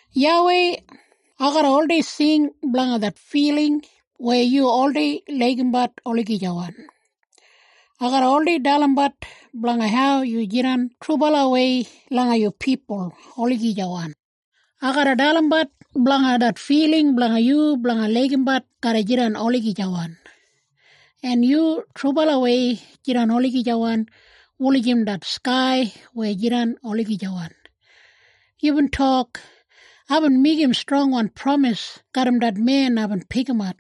YAWEI, ai garra oldei sing blanga det filing weya yu oldei laigimbat olagijawan. Ai garra oldei dalimbat blanga hau yu jidan trubalawei langa yu pipul olagijawan. Ai garra dalimbat blanga det filing blanga yu blanga laigimbat garra jidan olagijawan, en yu trubalawei jidan olagijawan wulijim det skai weya jidan olagijawan. Yubin tok, “Aibin meigim strongwan pramis garram det men aibin pikimat.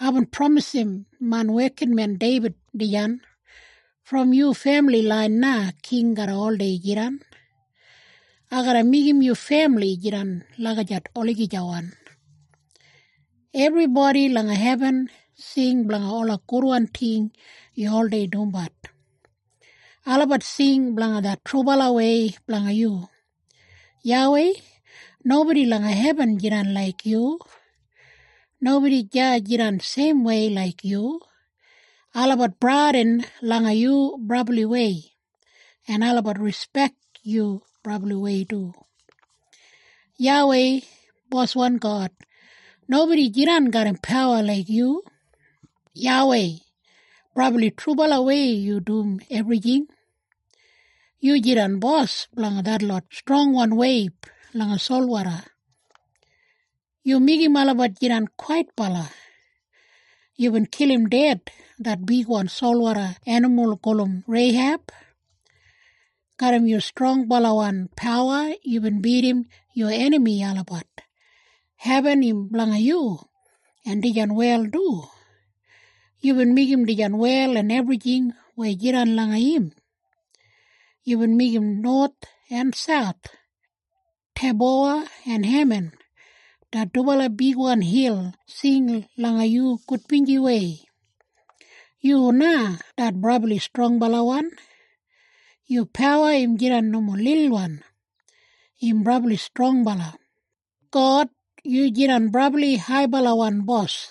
Aibin pramisim main wekinmen Deibid dijan. ‘Brom yu femili lain na king garra oldei jidan. Ai garra meigim yu femili jidan lagijat olagijawan.’” Ebribodi langa hebin sing blanga ola gudwan ting yu oldei dumbat. Olabat sing blanga det trubalawei blanga yu. YAWEI, nobodi langa hebin jidan laik yu. Nobodi deya jidan seimwei laik yu. Olabat bradin langa yu brabliwei, en olabat rispek yu brabliwei du. YAWEI, Boswan God, nobodi jidan garram pawa laik yu. YAWEI, brabli trubalawei yu dum ebrijing. Yu jidan bos blanga detlot strongwan weib langa solwoda. Yu meigim olabat jidan kwaitbala. Yubin kilim ded det bigwan solwoda enimul gulum Reiheb. Garram yu strongbalawan pawa yubin bidim yu enami olabat. Hebin im blanga yu, en dijan wel du. Yubin meigim dijan wel en ebrijing weya jidan langa im. Yubin meigim nowath en sauth. Teibowa en Heman, det dubala bigwan hil sing langa yu gudbinjiwei. Yu na det brabli strongbalawan. Yu pawa im jidan nomo lilwan. Im brabli strongbala. God, yu jidan brabli haibalawan bos,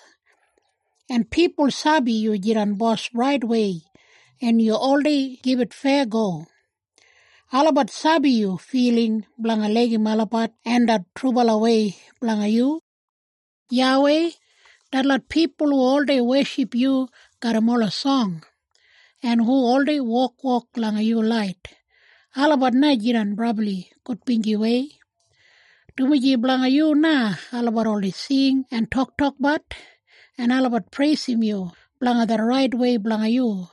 en pipul sabi yu jidan bos raitwei en yu oldei gibit feyago. Olabat sabi yu filing blanga laigim olabat en det trubalawei blanga yu. YAWEI, detlot pipul hu oldei weship yu garram ola song, en hu oldei wokwok langa yu lait, olabat na jidan brabli gudbinjiwei. Dumaji blanga yu na, olabat oldei sing en toktokbat, en olabat preisim yu blanga det raitwei blanga yu.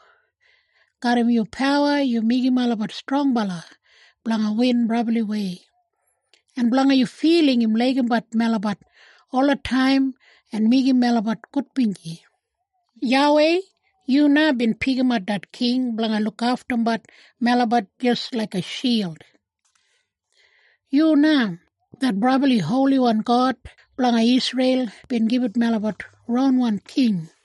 Garram yu pawa yu meigim melabat strongbala blanga win brabliwei. En blanga yu filing im laigimbat melabat olataim en meigim melabat gudbinji. YAWEI, yu na bin pikimat det king blanga lukaftumbat melabat jis laiga shild. Yu na, det brabli Holiwan God blanga Isreil bin gibit melabat ronwan king.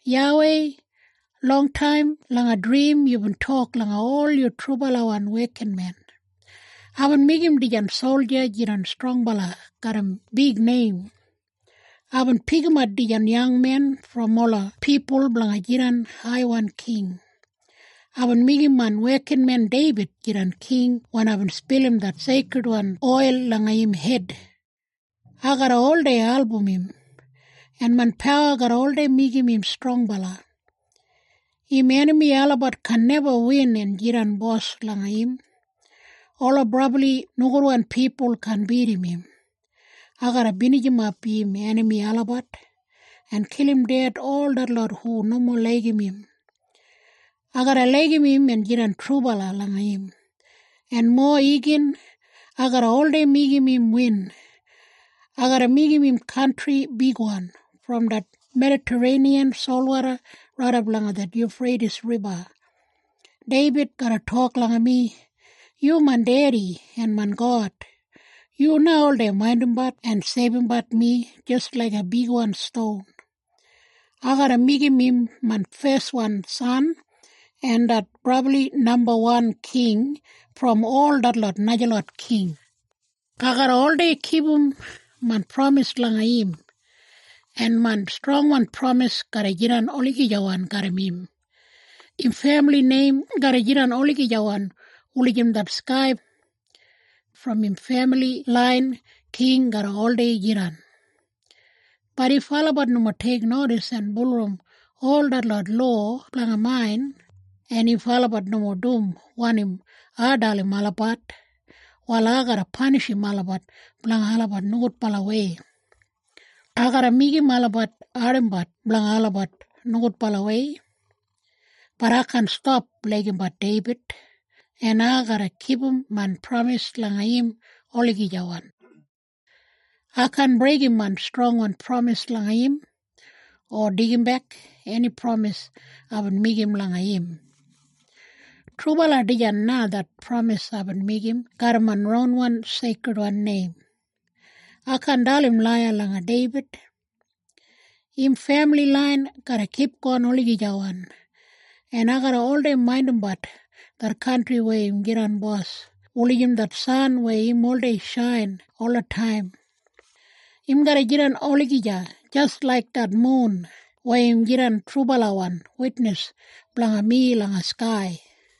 YAWEI, longtaim langa drim yubin tok langa ol yu trubalawan wekinmen, “Aibin meigim dijan solja jidan strongbala garram big neim. Aibin pikimat dijan yangmen brom ola pipul blanga jidan haiwan king. Aibin meigim main wekinmen Deibid jidan king wen aibin spilim det seikridwan oil langa im hed. Ai garra oldei album im, en main pawa garra oldei meigim im strongbala. Im enami olabat kaan neba win en jidan bos langa im. Ola brabli nogudwan pipul kaan bidim im. Ai garra binijimap im enami olabat, en kilim ded ol detlot hu nomo laigim im. Ai garra laigim im en jidan trubala langa im. En mowa igin, ai garra oldei meigim im win. Ai garra meigim im kantri bigwan, brom det Medatareiniyan solwoda raidap langa det Yufreitis Riba. Deibid garra tok langa mi, ‘Yu main dedi en main God. Yu na oldei maindimbat en seibumbat mi jis laiga bigwan ston.’ Ai garra meigim im main feswan san, en det brabli nambawan king brom ol detlot najalot king. Ai garra oldei kipum main pramis langa im, en main strongwan pramis garra jidan olagijawan garram im. Im femili neim garra jidan olagijawan wulijim det skai. Brom im femili lain, king garra oldei jidan. “Bat if olabat nomo teiknodis en bulurrum ol detlot lowa blanga main, en if olabat nomo dum wanim ai dalim olabat, wal ai garra panishim olabat blanga olabat nogudbalawei. Ai garra meigim olabat ardimbat blanga olabat nogudbalawei. Bat ai kaan stap laigimbat Deibid, en ai garra kipum main pramis langa im olagijawan. Ai kaan breigim main strongwan pramis langa im, o deigimbek eni pramis aibin meigim langa im. “Trubala dijan na det pramis aibin meigim garram main ronwan seikridwan neim. Ai kaan dalim laiya langa Deibid. Im femili lain garra kipgon olagijawan. En ai garra oldei maindimbat det kantri weya im jidan bos wulijim det san weya im oldei shain olataim. Im garra jidan olagija jis laik det mun, weya im jidan trubalawan witnis blanga mi langa skai.”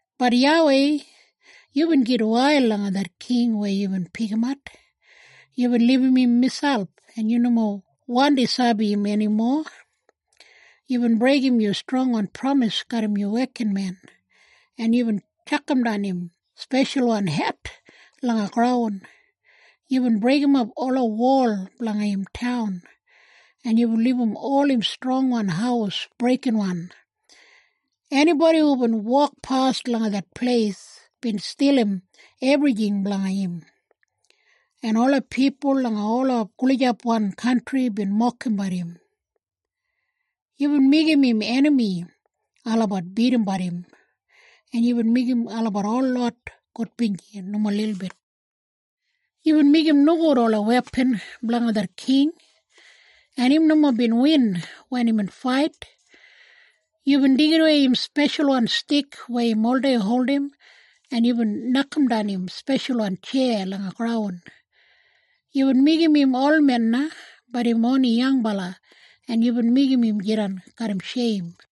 Bat YAWEI, yubin gitwail langa det king weya yubin pikimat. Yubin libum im miselp en yu nomo wandi sabi im enimo. Yubin breigim yu strongwan pramis garram yu wekinmen, en yubin tjakamdan im speshalwan het langa graun. Yubin breigimap ola wol blanga im taun, en yubin libum ol im strongwan haus breikinwan. Enibodi hubin wokpas langa det pleis bin stilim ebrijing blanga im. En ola pipul langa ola gulijapwan kantri bin mokimbat im. Yubin meigim im enami olabat bidimbat im, en yubin meigim olabat holot gudbinji nomo lilbit. Yubin meigim nogud ola wepan blanga det king, en im nomo bin win wen imbin fait. Yubin deigidawei im speshalwan stik weya im oldei holdim, en yubin nokamdan im speshalwan tjeya langa graun. Yubin meigim im olmen na, bat im oni yangbala, en yubin meigim im jidan garram sheim.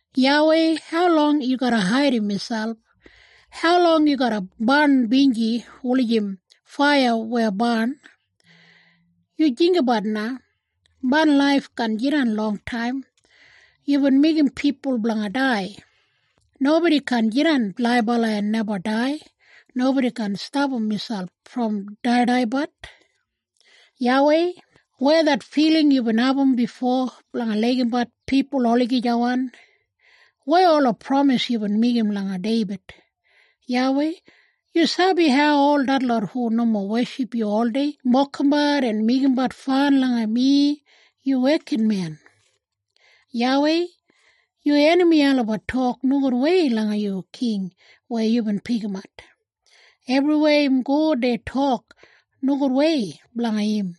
YAWEI, haulong yu garra haidim miselp? Haulong yu garra barn binji wulijim faiya weya barn? Yu jinggabat na. Main laif kaan jidan longtaim. Yubin meigim pipul blanga dai. Nobodi kaan jidan laibala en neba dai. Nobodi kaan stapam miselp brom daidaibat. YAWEI, weya det filing yubin abum bifo blanga laigimbat pipul olagijawan? Weya ola pramis yubin meigim langa Deibid? YAWEI, yu sabi hau ol detlot hu nomo weship yu oldei mokimbat en meigimbat fan langa mi, yu wekinmen. YAWEI, yu enami olabat tok nogudwei langa yu king weya yubin pikimat. Ebriweya im go dei tok nogudwei blanga im.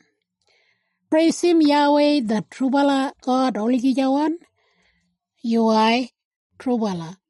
Preisim YAWEI det trubala God olagijawan. Yuwai! Trubala!